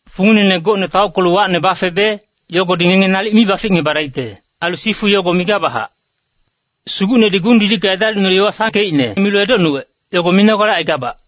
Funginene gocne taockelu wacne bafebe, yogodi ngenge nalic mi baficngebadaicte. Ailu sifu yogo migabachac. Sugucnedi gung-didicka edalicnulu yowa sangkeicne milu edocnuwec, yogo minogale aigabac.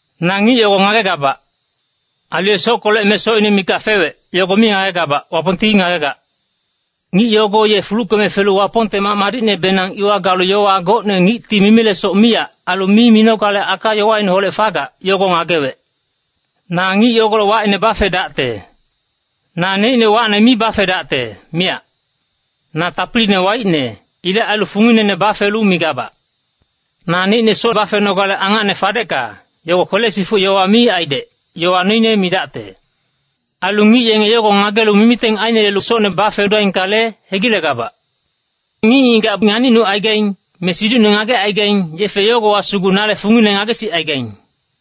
Na ngic yogo ngagegabac. Ailu ye sockolec me socine mikac fewec, yogo mi ngagegabac, Wapongti ngagegac. Ngic yogo ye fuluckeme felu Wapongte mac madicnebenang iwa galu yowa gocne ngicti mimilesoc miyac. Ailu mi minogale aka-yowaineholec fagac, yogo ngagewec. Na ngic yogolec wacine bafedacte. Naneicne wacne mi bafedacte, miyac. Na tapiline waicne. Ilec ailu funginene bafelu migabac. Naneicne soc bafenogale angacne fadecka, yogo kwele-sifuc yowa mi aidec, yowa noine midacte. Ailu ngic yenge yogo ngagelu mimiteng ainelelu socne bafedaingkale, hegilegabac. Ngic-ngigac nganicnucaigaing, me siducne ngagecaigaing, yefe yogowa sugu nale fungine ngagesicaigaing.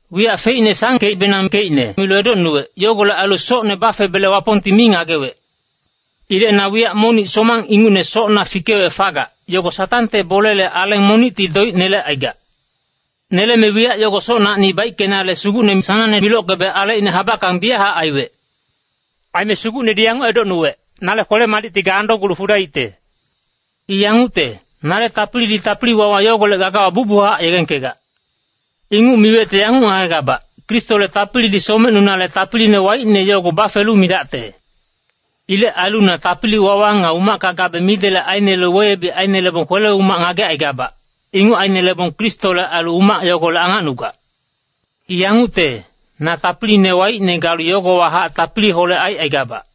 Wiyac feicne sangkebenangkeicne milu edocnuwec. Yogolec ailu socne bafebele Wapongti mi ngagewec. Ilec na wiyac monic somang ingucne socna fikewec fagac, yogo Satangte bolele aleng monicti doic nelecaigac. Neleme wiyac yogo socnacni baickenale Sugucne sanangne milockebe alecine habackang biyachac aiwec. Aime Sugucnedi yanguc edocnuwec, “Nale kwele-madicti ga andocgulu fadaicte. I yangucte, nale tapilidi tapili-wawa yogolec gagawa bucbuchac yegengkegac.” Inguc miwecte yanguc ngagegabac, Kristole tapilidi somecnunale tapiline waicne yogo bafelu midacte. Ilec ailu na tapili-wawa nga umacka gabe midelec ainelelu weyebic ainelebong kwele-umac ngagecaigabac. Inguc ainelebong Kristole ailu umac yogolec angacnugac. I yangucte, na tapiline waicne galu yogowahac tapiliholec aicaigabac.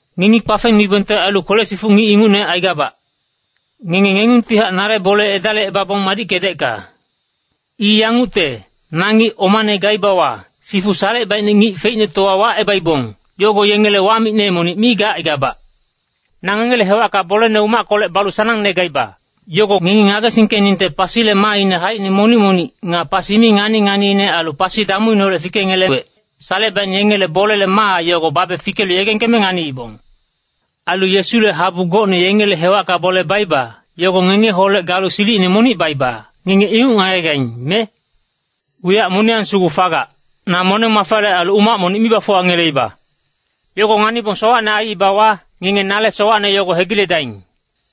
Ngengi kpafengnuibongte ailu kwele-sifuc ngic ingucne aigabac. Ngenge ngengungtihac nale bole edalicebabong madickedecka. I yangucte, na ngic omane gaibawa, sifu salecebaicne ngic feicnetowa wacebaibong, yogo yengele wamicne monic mi gacaigabac. Na ngengele hewacka bolene umackolec balu sanangne gaiba. Yogo ngengi ngagesingkeningte pasile maaine haicine monic-monic, nga pasi mi ngani-nganiine ailu pasi damuineholec fikengelewec. Salecebaicne yengele bolele maa yogo babe fikelu yegengkeme nganiibong. Ailu Yesule habu gocne yengele hewacka bole baiba, yogo ngengeholec galu silicine monic baiba, ngenge inguc ngagegaing, me? Wiyac moniyang sugu fagac, na moneng-mafale ailu umac monic mi bafuwangeleiba. Yogo nganibong sowacne aiibawa, ngenge nale sowacne yogo hegiledaing.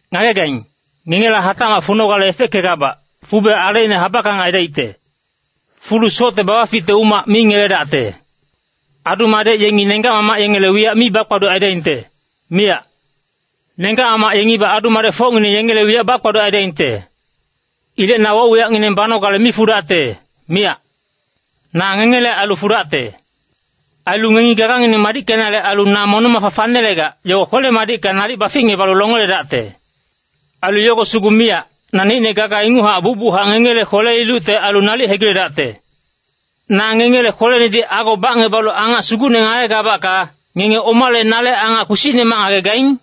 Ngagegaing, ngengela hatacmac funogale efeckegabac, fube alecine habackang aidaicte. Fulu socte babaficte umac mi ngeledacte. Adu-madec yengi nenggac-mamac yengele wiyac mi bakpaduc aidaingte, miyac. Nenggac-mamac yengibac adu-madecfocngineng yengele wiyac bakpaduc aidaingte. Ilec na woc-wiyacngineng banogale mi fudacte, miyac. Na ngengele ailu fudacte. Ailu ngengi gagangineng madickenale ailu na moneng-mafa fanelegac, yogo kwele-madicka nalic baficngebalu longeledacte. Ailu yogo sugu miyac, naneicne gaga inguchac bucbuchac ngengele kwele-ilucte ailu nalic hegiledacte. Na ngengele kwelenedi ago bacngebalu angac sugucne ngagegabacka, ngenge omale nale angac kpisicnemac ngagegaing?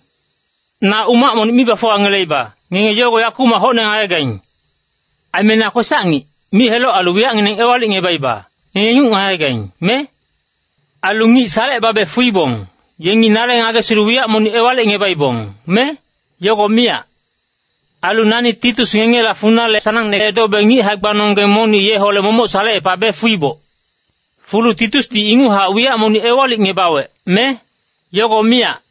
Na umac monic mi bafuwangeleiba, ngenge yogo yakumac hocne ngagegaing. Aime na kwesac-ngic, mic-heloc ailu wiyacngineng ewalicngebaiba, ngenge inguc ngagegaing, me? Ailu ngic salecebabe fuibong, yengi nale ngagesilu wiyac monic ewalicngebaibong, me? Yogo miyac. Ailu nani Titus ngengela funale sanangne edobe ngic hae-gbanonggeng monic yeholec momoc salecepabe fuiboc. Fulu Titusdi inguchac wiyac monic ewalicngebawec, me? Yogo miyac.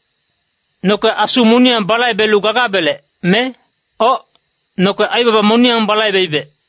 Noke asu moniyang balaibelu gagabelec, me? Oc, noke aibaba moniyang balaibeibec.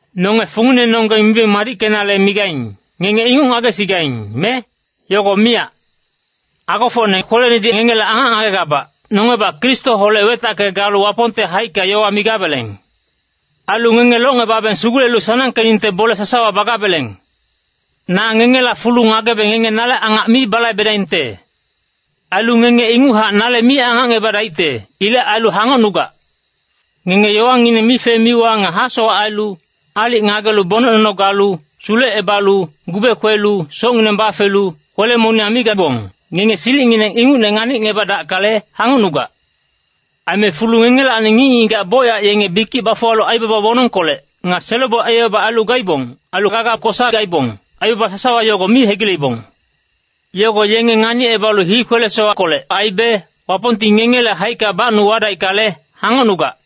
Nonge funginenonggeng mibeng madickenale migaing, ngenge inguc ngagesigaing, me? Yogo miyac. Agofocne kwelenedi ngengele angac ngagegabac, nongebac Kristoholec wetacke galu Wapongte haicka yowa migabeleng. Ailu ngenge locngebabeng sugulelu sanangkeningte bole sasawa bagabeleng. Na ngengela fulu ngagebe ngenge nale angac mi balaibedaingte. Ailu ngenge inguchac nale mi angacngebadaicte. Ilec ailu hangocnugac. Ngenge yowangineng mife-miwa nga hasowac ailu, aalic ngagelu bonec nono galu, sulecebalu, gube kwelu, socngineng bafelu, kwele-moniyang mi gabong, ngenge silicngineng ingucne nganicngebadackale, hangocnugac. Aime fulu ngengelacni ngic-ngigac bocyac yenge bikic bafuwalu aibaba wonongkolec, nga selo-boic aibaba ailu gaibong. Ailu gaga kosa gaibong, aibaba sasawa yogo mi hegileibong. Yogo yenge nganicebalu hii kwele-sowackolec aibe, Wapongti ngengele haicka bacnu wadaickale, hangocnugac.